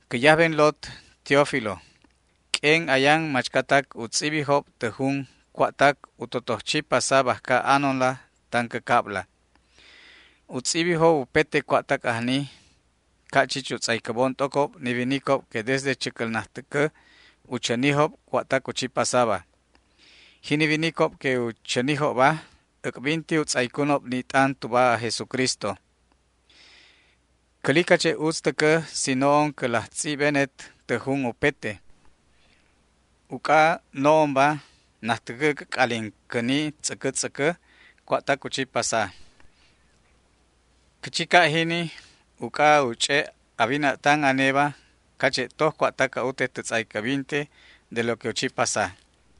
Cä yajben lot, Teófilo: Q'uen ayan machcatac u tz'ibijob tä jun cua'tac u totoj chi pasa bajca anonla tan cä cabla. U tz'ibijob upete cua'tac ajni, ca' chich u tz'aycäbon t'ocob ni winicob que desde chäcäl najtäcä u chänijob cua'tac u chi pasaba. Jini winicob que u chänijobba äc'binti u tz'aycunob ni t'an tuba aj Jesucristo. Cäli cache' utz täcä si no'on cä laj tz'ibbenet tä jun upete, uc'a no'onba najtäcä cä c'alin cäni tz'äcä tz'äcä cua'tac u chi pasa. Cä chi ca' jini uc'a u ch'e' a wina'tan aneba cache' toj cua'tac a'utet tä tz'aycäbinte de lo que u chi pasa.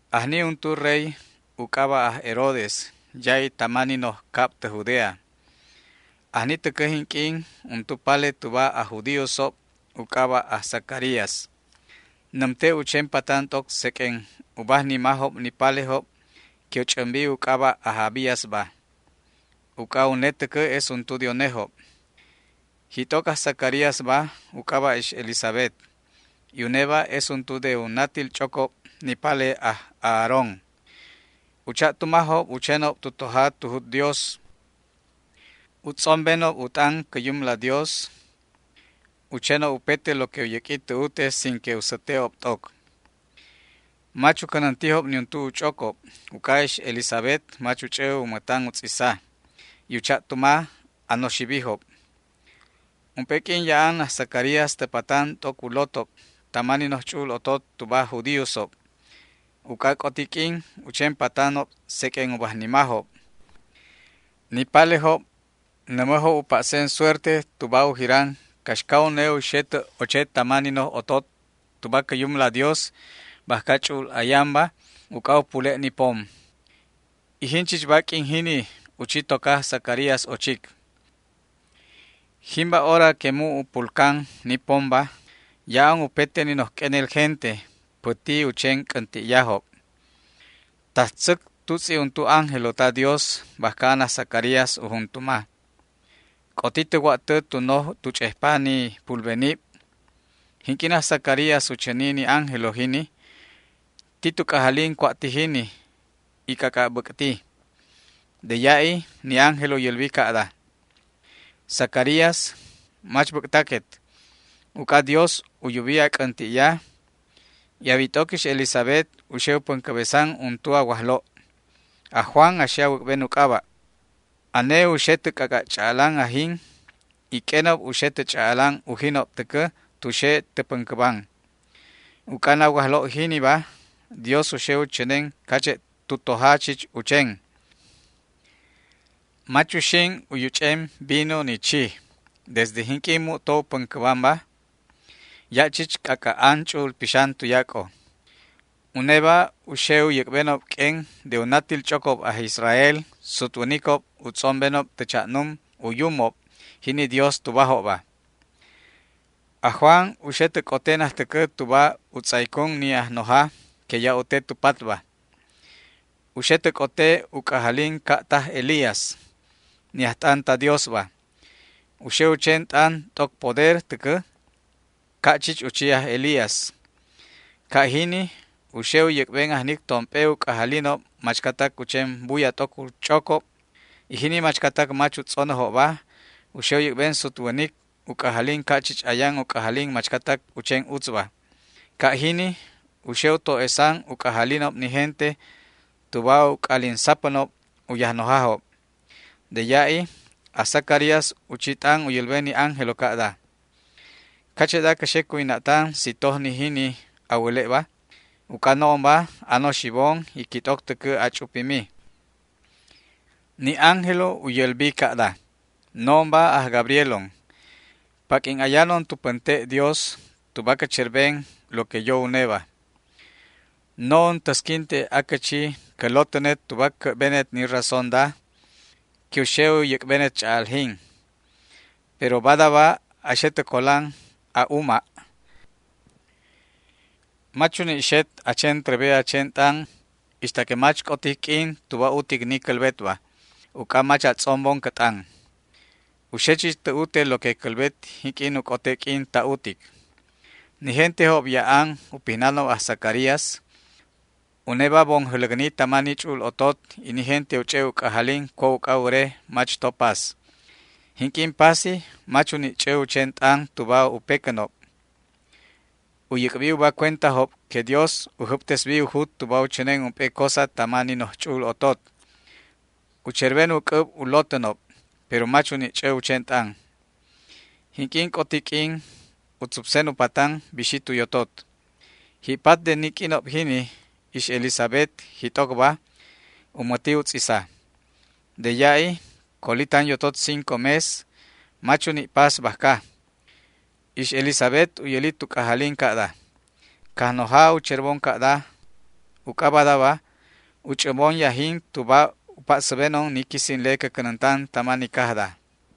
Ajni untu rey u c'aba' aj Herodes ya'i tama ni noj cab tä Judea. Ajni täcä jinq'uin untu pale tuba aj judíosob u c'aba' aj Zacarías. Nämte' u chen patan t'oc seq'uen u bajnimajob ni palejob que u ch'ämbi u c'aba' aj Abíasba, uc'a une täcä es untu de unejob. Jit'oc aj Zacaríasba u c'aba' ix Elisabet, y uneba es untu de u natil ch'ocob ni pale aj Aarón. U cha'tumajob u chenob tu toja tu jut Dios. U tz'ombenob u t'an cä Yumla Dios. U chenob upete lo que u yäq'ui tä ute sin que u säte'ob t'oc. Mach u cänäntijob niuntu u ch'ocob uc'a ix Elisabet mach u ch'ä u mätan u tz'isa, y u cha'tuma anoxibijob. Ump'e q'uin ya'an aj Zacarías tä patan t'oc u lotob tama ni noj ch'u'ul otot tuba aj judíosob, uc'a ac'oti q'uin u chen patanob seq'uen u bajnimajob. Ni palejob nämäjob u pa'sen suerte tuba u jiranob caxca une u xe tä oche tama ni noj otot tuba cä Yumla Dios bajca ch'u'ul ayanba uc'a u pule' ni pom, y jinchichba q'uin jini u chi toca aj Zacarías ochic. Jimba hora que mu' u pulcan ni pomba ya'an upete ni noj q'uenel gente päti u chen c'änti'yajob. Tajtzäc tutz'i untu ángelo ta Dios bajca an aj Zacarías u juntuma. C'oti tä wa'tä tu noj tu ch'ejpa ni pulbenib. Jinq'uin aj Zacarías u chäni ni ángelo jini, ti tu c'ajalin cua' ti jini y c'ac'a' bäc'ti. De ya'i ni ángelo u yälbi ca'da: ―Zacarías, mach bäc'taquet; uc'a Dios u yubi na c'änti'ya, y a wit'oc ix Elisabet u xe u päncäbesan untu a wajlo'. Aj Juan a xe a wäc'ben u c'aba'. Ane u xe tä c'ac'a' ch'a'alan ajin y q'uenob u xe tä ch'a'alan ujinob täcä tu xe tä päncäban; uc'a na wajlo' jiniba Dios u xe u chänen cache' tu toja chich u chen. Mach uxin u yuch'en vino ni chij. Desde jinq'uin mu'to u päncäbanba ya' chich c'ac'a' an Ch'u'ul Pixan tuyac'o. Uneba u xe u yäc'benob q'uen de u natil ch'ocob aj Israel sutwänicob u tz'ombenob tä cha'num u Yumob, jini Dios tubajobba. Aj Juan u xe tä c'ote najtäcä tuba u tz'aycun ni Ajnoja que ya' u te tu patba. U xe tä c'ote u c'ajalin ca' taj Elías, ni ajt'an ta Diosba. U xe u chen t'an t'oc poder täcä ca' chich u chi aj Elías. Ca' jini u xe u yäc'ben ajnic tomp'e u c'ajalinob machcatac u chen buya t'oc u ch'ocob, y jini machcatac mach u tz'onäjobba u xe u yäc'ben sutwänic u c'ajalin ca' chich ayan u c'ajalin machcatac u chen utzba. Ca' jini u xe u to'esan u c'ajalinob ni gente tuba u c'alin sapänob u Yajnojajob. De ya'i aj Zacarías u chi t'an u yälben ni ángelo ca'da: ―¿Cache'da cä xe cuwina'tan si toj ni jini a wäle'ba? Uc'a no'onba anoxibon y quit'oc täcä ach'upimi. Ni ángelo u yälbi ca'da: ―No'onba aj Gabrielon. Paq'uin ayanon tu pänte' Dios tuba cä cherben lo que yo Uneba. No'on täsquinte acä chi cä lotänet tuba cä'benet ni razónda que u xe u yäc'benet ch'a'aljin. Pero badaba, a xe tä colan a'uma', mach uni' xet a chen trebe a chen t'an ixta que mach c'otic q'uin tuba utic ni cälbetba, uc'a mach a tz'ombon cä t'an. U xe chich tä ute lo que cälbet jinq'uin u c'ote q'uin ta utic. Ni gentejob ya'an u pitänob aj Zacarías. Uneba bon jäläcni tama ni ch'u'ul otot y ni gente u ch'e' u c'ajalin cua' uc'a wäre mach to pas. Jinq'uin pasi mach u ni' ch'ä u chen t'an tuba u pecänob. U yäc'bi uba cuentajob que Dios u jäbtesbi u jut tuba u chänen ump'e cosa tama ni noj ch'u'ul otot. U cherben u c'äb u lotänob, pero mach u ni' ch'ä u chen t'an. Jinq'uin c'oti q'uin u tzupsen u patan, bixi tu yotot. Ji'pat de ni q'uinob jini ix Elisabet, jit'ocba, u mäti u tz'isa. De ya'i coli tan yotot cinco mes, mach uni' pas bajca. Ix Elisabet u yäli tu c'ajalin ca'da: “Cajnoja u cherbon ca'da, uc'a badaba u ch'ämbon yajin tuba u pa'säbenon ni quisinle cä cänäntan tama ni cajda”.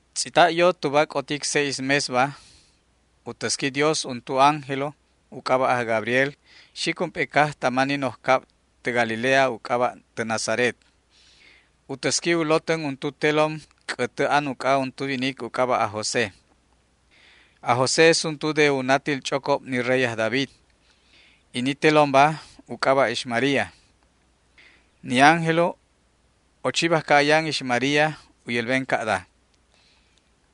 Tz'ita' yo tuba c'otic seis mesba, u täsqui Dios untu ángelo u c'aba' aj Gabriel xic ump'e caj tama ni noj cab tä Galilea u c'aba' tä Nazaret. U täsqui u lotän untu telom c'ätä an uc'a untu winic u c'aba' aj José. Aj José es untu de u natil ch'ocob ni rey aj David, y ni telomba u c'aba' ix María. Ni ángelo ochi bajca ayan ix María u yälben ca'da: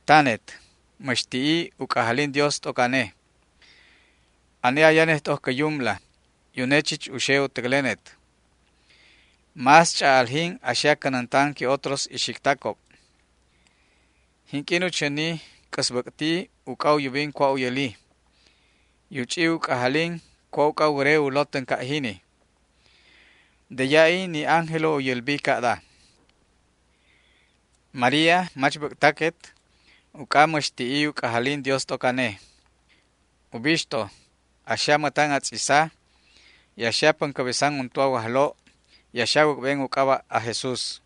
―¡Tanet, mäx ti'i u c'ajalin Dios t'oc ane! Ane ayanet t'oc cä Yumla y une chich u xe u täclenet. Más ch'a'aljin a xe a cänäntan que otros ixictacob. Jinq'uin u chäni c'äsbäc'ti uc'a u yubin cua' u yäli, y u ch'i u c'ajalin cua' uc'a wäreca u lotän ca' jini. De ya'i ni ángelo u yälbi ca'da: ―María, mach bäc'taquet, uc'a mäx ti'i u c'ajalin Dios t'oc ane. Ubixto, a xe a mätan a tz'isa, y a xe a päncäbesan untu a wajlo' y a xe a wäc'ben u c'aba' aj Jesús.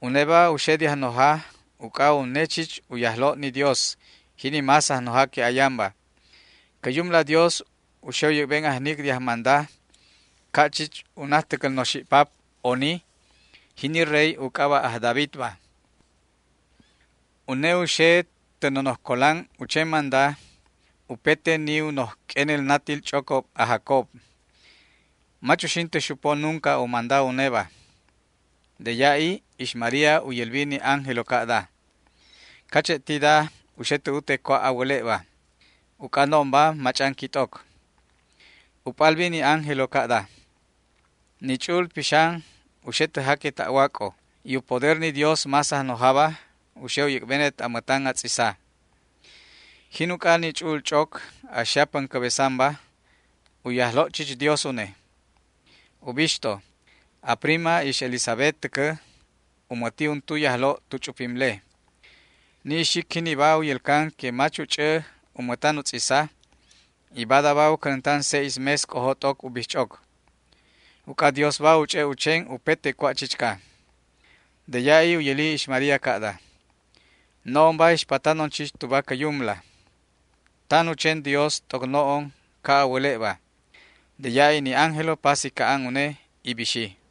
Uneba u xe de Ajnoja uc'a une chich u Yajlo' ni Dios, jini más Ajnoja que ayanba. Cä Yumla Dios u xe u yäc'ben ajnic de ajmanda ca' chich u najtäcäl noxi'pap oni, jini rey u c'aba' aj Davidba. Une u xe tä nonoj colan u chen manda upete ni u noj q'uenel natil ch'ocob aj Jacob. Mach uxin tä xupo nunca u manda uneba. De ya'i ix María u yälbi ni ángelo ca'da: ―¿Cache' ti da u xe tä ute cua' a wäle'ba? Uc'a no'onba mach'an quit'oc. U p'albi ni ángelo ca'da: ―Ni Ch'u'ul Pixan u xe tä jaque ta'wac'o, y u poder ni Dios más Ajnojaba u xe u yäc'benet a mätan a tz'isa. Jin uc'a ni Ch'u'ul Ch'oc a xe a päncäbesanba, u Yajlo' chich Dios une. Ubixto, a prima ix Elisabet täcä u mäti untu yajlo' tu ch'upimle. Ni ixic jiniba u yälcan que mach u ch'ä u mätan u tz'isa, y badaba u cänäntan seis mes c'ojo t'oc u bijch'oc. Uc'a Diosba u ch'e' u chen upete cua' chichca. De ya'i u yäli ix María ca'da: ―No'onba ixpatanon chich tuba cä Yumla. Tan u chen Dios t'oc no'on ca' a wäle'ba. De ya'i ni ángelo pasi ca'an une y bixi.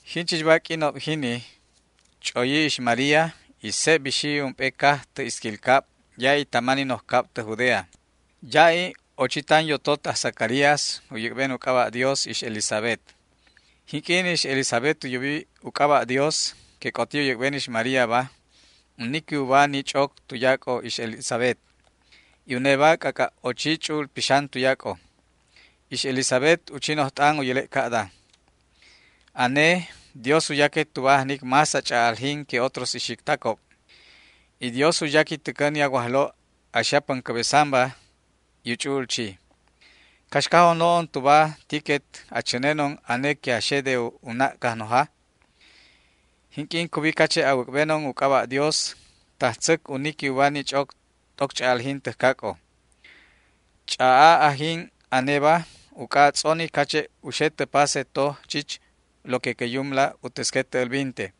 Jinchichba q'uinob jini ch'oyi ix María, y seb bixi ump'e caj tä isquil cab ya'i tama ni noj cab tä Judea. Ya'i ochi tan yotot aj Zacarías u yäc'ben u c'aba' Dios ix Elisabet. Jinq'uin ix Elisabet u yubi u c'aba' Dios que c'oti u yäc'ben ix Maríaba, u niqui uba ni ch'oc tuyac'o ix Elisabet, y uneba c'ac'a' ochi Ch'u'ul Pixan tuyac'o. Ix Elisabet u chi noj t'an u yäle' ca'da: ―Ane Dios u yaquet tuba ajnic más a ch'a'aljin que otros ixictacob, y Dios u yaqui täcä ni a Wajlo' a xe a päncäbesanba y u ch'u'ul chi. ¿Caxcajon no'onba tuba tiquet a chänenon, ane que a xe de u na' Cajnoja? Jinq'uin cubi cache' a wäc'benon u c'aba' Dios, tajtzäc u niqui uba ni ch'oc t'oc ch'a'aljin täjcac'o. Ch'a'a ajin aneba uc'a a tz'oni cache' u xe tä pase toj chich lo que cä Yumla u täsquet tä älbinte.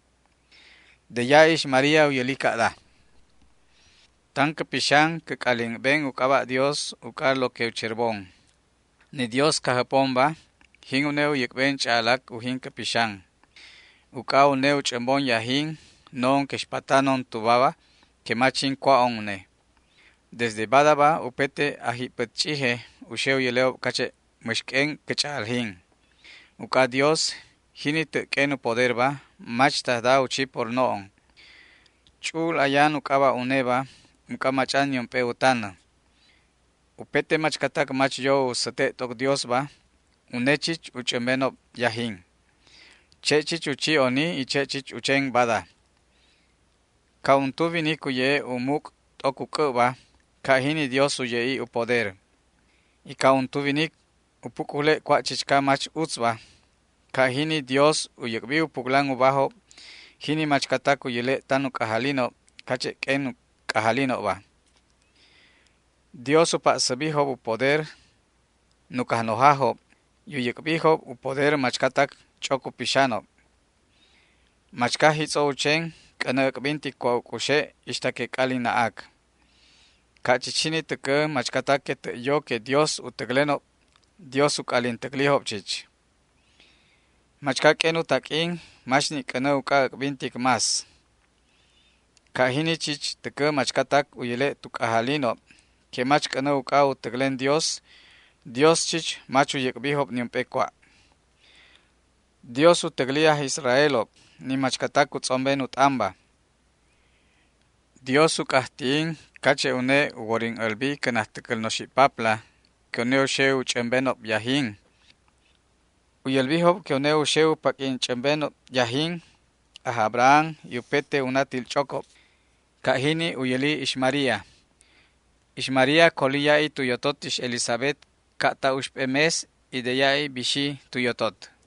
De ya'i ix María u yäli ca'da: Tan cä pixan cä c'alin ben u c'aba' Dios uc'a lo que u cherbon. Ni Dios Cajjäpomba, jin une u yäc'ben ch'a'alac ujin cä pixan, uc'a une u ch'ämbon yajin, no'on que ixpatanon tubaba que mach jin cua'on une. Desde badaba upete ajji'pät ch'ije u xe u yäle'ob cache' mäx q'uen cä ch'a'aljin, uc'a Dios, jini tä' q'uen u poderba, machtajda u chi por no'on. Ch'u'ul ayan u c'aba' uneba uc'a mach'an niump'e u tanä. Upete machcatac mach yo u säte' t'oc Diosba, une chich u ch'ämbenob yajin. Che' chich u chi oni y che' chich u chen bada. Ca' untu winic u ye'e' u muc' t'oc u c'äbba, ca' jini Dios u ye'i u poder. Y ca' untu winic u puc'jule' cua' chichca mach utzba, ca' jini Dios u yäc'bi u puclan ubajob jini machcatac u yäle' tan u c'ajalinob cache' q'uen u c'ajalinobba. Dios u pa'säbijob u poder nuc ajnojajob y u yäc'bijob u poder machcatac ch'oc u pixanob. Machca jitz'o u chen c'änä äc'bintic cua' u c'uxe' ixta que c'alin na'ac. Ca' chich jini täcä machcatac que tä' yo que Dios u täclenob, Dios u c'alin täclijob chich. Machca q'uen u taq'uin mach ni' c'änä uc'a äc'bintic más. Ca' chich jini täcä machcatac u yäle' tu c'ajalinob que mach c'änä uc'a u täclen Dios, Dios chich mach u yäc'bijob niump'e cua'. Dios u täcli aj Israelob, ni machcatac u tz'omben u t'anba. Dios u c'ajti'in cache' une u worin älbi cä najtäcäl noxi'papla que une u xe u ch'ämbenob yajin. U yälbijob que une u xe u paq'uin ch'ämben yajin aj Abraham y upete u natil ch'ocob. Ca' jini u yäli ix María. Ix María coli ya'i tu yotot ix Elisabet ca' ta uxp'e mes y de ya'i bixi tu yotot.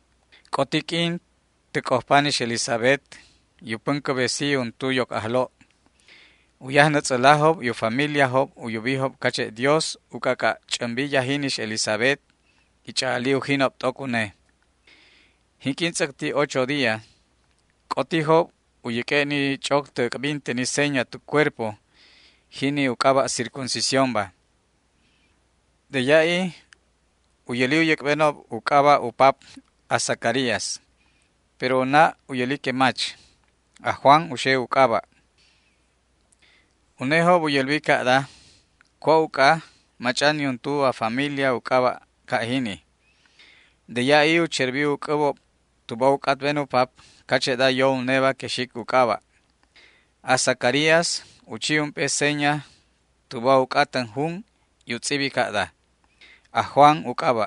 C'oti q'uin tä c'ojpan ix Elisabet, y u päncäbesi untu yoc ajlo'. U yajnätz'älajob y u familiajob u yubijob cache' Dios u c'ac'a' ch'ämbi yajin ix Elisabet y ch'a'ali ujinob t'oc une. Jinq'uin tz'äcti ocho día, c'otijob u yäq'ue' ni ch'oc tä äc'binte ni seña tu cuerpo, jini u c'aba' circuncisiónba. De ya'i u yäli u yäc'benob u c'aba' u pap, aj Zacarías. Pero u na' u yäli que mach. Aj Juan u xe u c'aba'. Unejob u yälbi ca'da: ―¿Cua' uc'a? Mach'an niuntu a familia u c'aba' ca' jini. De ya'i u cherbi u c'äbob tuba u c'atben u pap cache'da yo uneba que xic u c'aba'. Aj Zacarías u chi ump'e seña tuba u c'atän jun, y u tz'ibi ca'da: “Aj Juan u c'aba'”.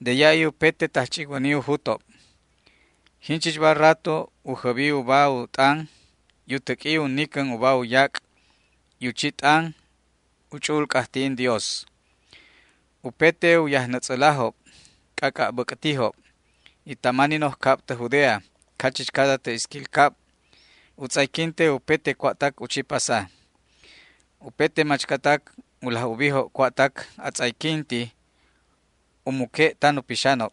De ya'i upete tajch'icwäni u jutob. Jinchichba rato u jäbi uba u t'an y u täq'ui u nicän uba yac' y u chi t'an u ch'u'ul c'ajti'in Dios. Upete u yajnätz'älajob c'ac'a' bäc'tijob, y tama ni noj cab tä Judea cachichcada tä isquil cab u tz'ayquinte upete cua'tac u chi pasa. Upete machcatac u laj ubijob cua'tac atz'ayquinti u muque' tan u pixanob.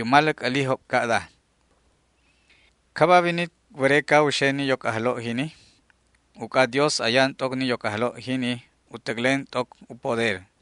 U maläc älijob ca'da: ―¿Caba winic wäreca u xe ni yoc ajlo' jini? Uc'a Dios ayan t'oc ni yoc ajlo' jini u täclen t'oc u poder.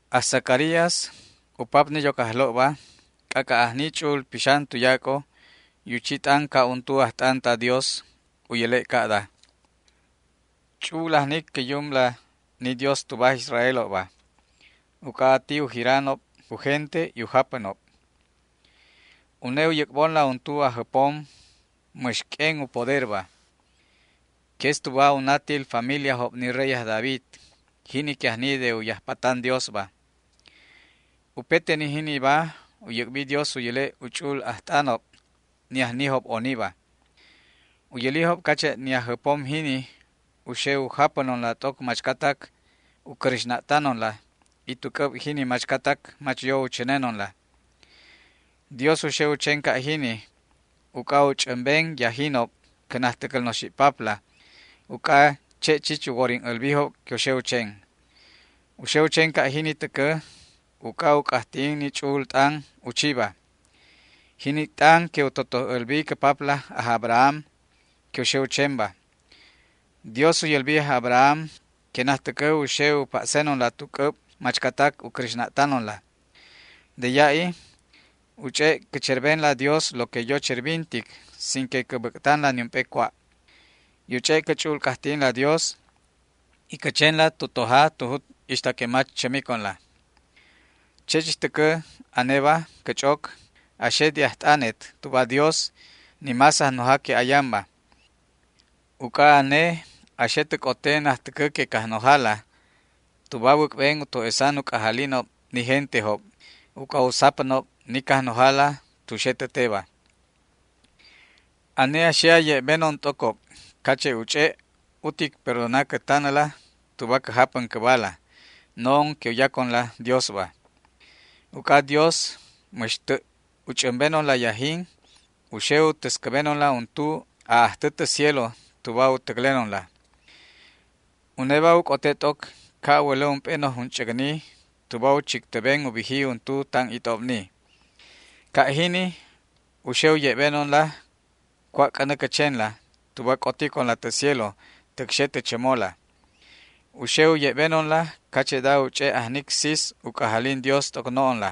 Aj Zacarías, u pap ni yoc ajlo'ba, c'ac'a' ajni Ch'u'ul Pixan tuyac'o y u chi t'an ca' untu ajt'an ta Dios, u yäle' ca'da: Ch'u'ul ajnic cä Yumla, ni Dios tuba aj Israelobba, uc'a ati u jiranob u gente y u japänob. Une u yäc'bonla untu Ajjäpom mäx q'uen u poderba, que es tuba u natil familiajob ni rey aj David, jini que ajni de u yajpatan Diosba. Upete ni jiniba u yäc'bi Dios u yäle' u ch'u'ul ajt'anob, ni ajnijob oniba. U yälijob cache' ni Ajjäpom jini u xe u japänonla t'oc machcatac u cräxna'tanonla y tu c'äb jini machcatac mach yo u chänenonla. Dios u xe u chen ca' jini uc'a u ch'ämben yajinob cä najtäcäl noxi'papla, uc'a che' chich u worin älbijob que u xe u chen. U xe u chen ca' jini täcä uc'a u c'ajti'in ni ch'u'ul t'an u chiba, jini t'an que u totoj älbi cä papla aj Abraham que u xe u chenba. Dios u yälbi aj Abraham que najtäcä u xe u pa'senonla tu c'äb machcatac u cräxna'tanonla. De ya'i u ch'e' cä cherbenla Dios lo que yo cherbintic sin que cä bäc'tanla niump'e cua', y u ch'e' cä ch'u'ul c'ajti'inla Dios y cä chenla tu toja tu jut ixta que mach chämiconla. Che' chich täcä aneba, cä ch'oc, a xe de ajt'anet tuba Dios, ni más Ajnoja que ayanba, uc'a ane a xe tä c'ote najtäcä de Cajnojala tuba a wäc'ben u to'esan u c'ajalinob ni gentejob, uc'a u sapänob ni Cajnojala tu xe tä teba. Ane a xe a ye'benon t'ocob cache' u ch'e' utic perdona cä tanäla tuba cä japän cäbala, no'on que u yaconla Diosba. Uc'a Dios mäx tä' u ch'ämbenonla yajin, u xe u täscäbenonla untu aj Ajtä tä cielo tuba u täclenonla. Uneba u c'ote t'oc ca' a wälä ump'e noj junch'äcni tuba u chictäben u biji untu tan it'obni. Ca' jini u xe u ye'benonla cua' c'änä cä chenla tuba c'oticonla tä cielo täc xe tä chämola. U xe u ye'benonla cache'da u ch'e' ajnic sis u c'ajalin Dios t'oc no'onla.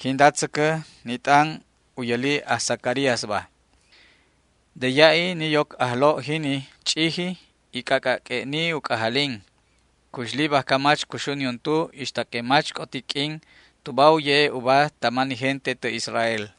Jinda tzäcä ni t'an u yäli aj Zacaríasba. De ya'i ni yoc ajlo' jini ch'iji y c'ac'a' q'ue'ni u c'ajalin. Cuxli bajca mach cuxu niuntu ixta que mach c'otic q'uin tuba u ye'e' uba tama ni gente tä Israel.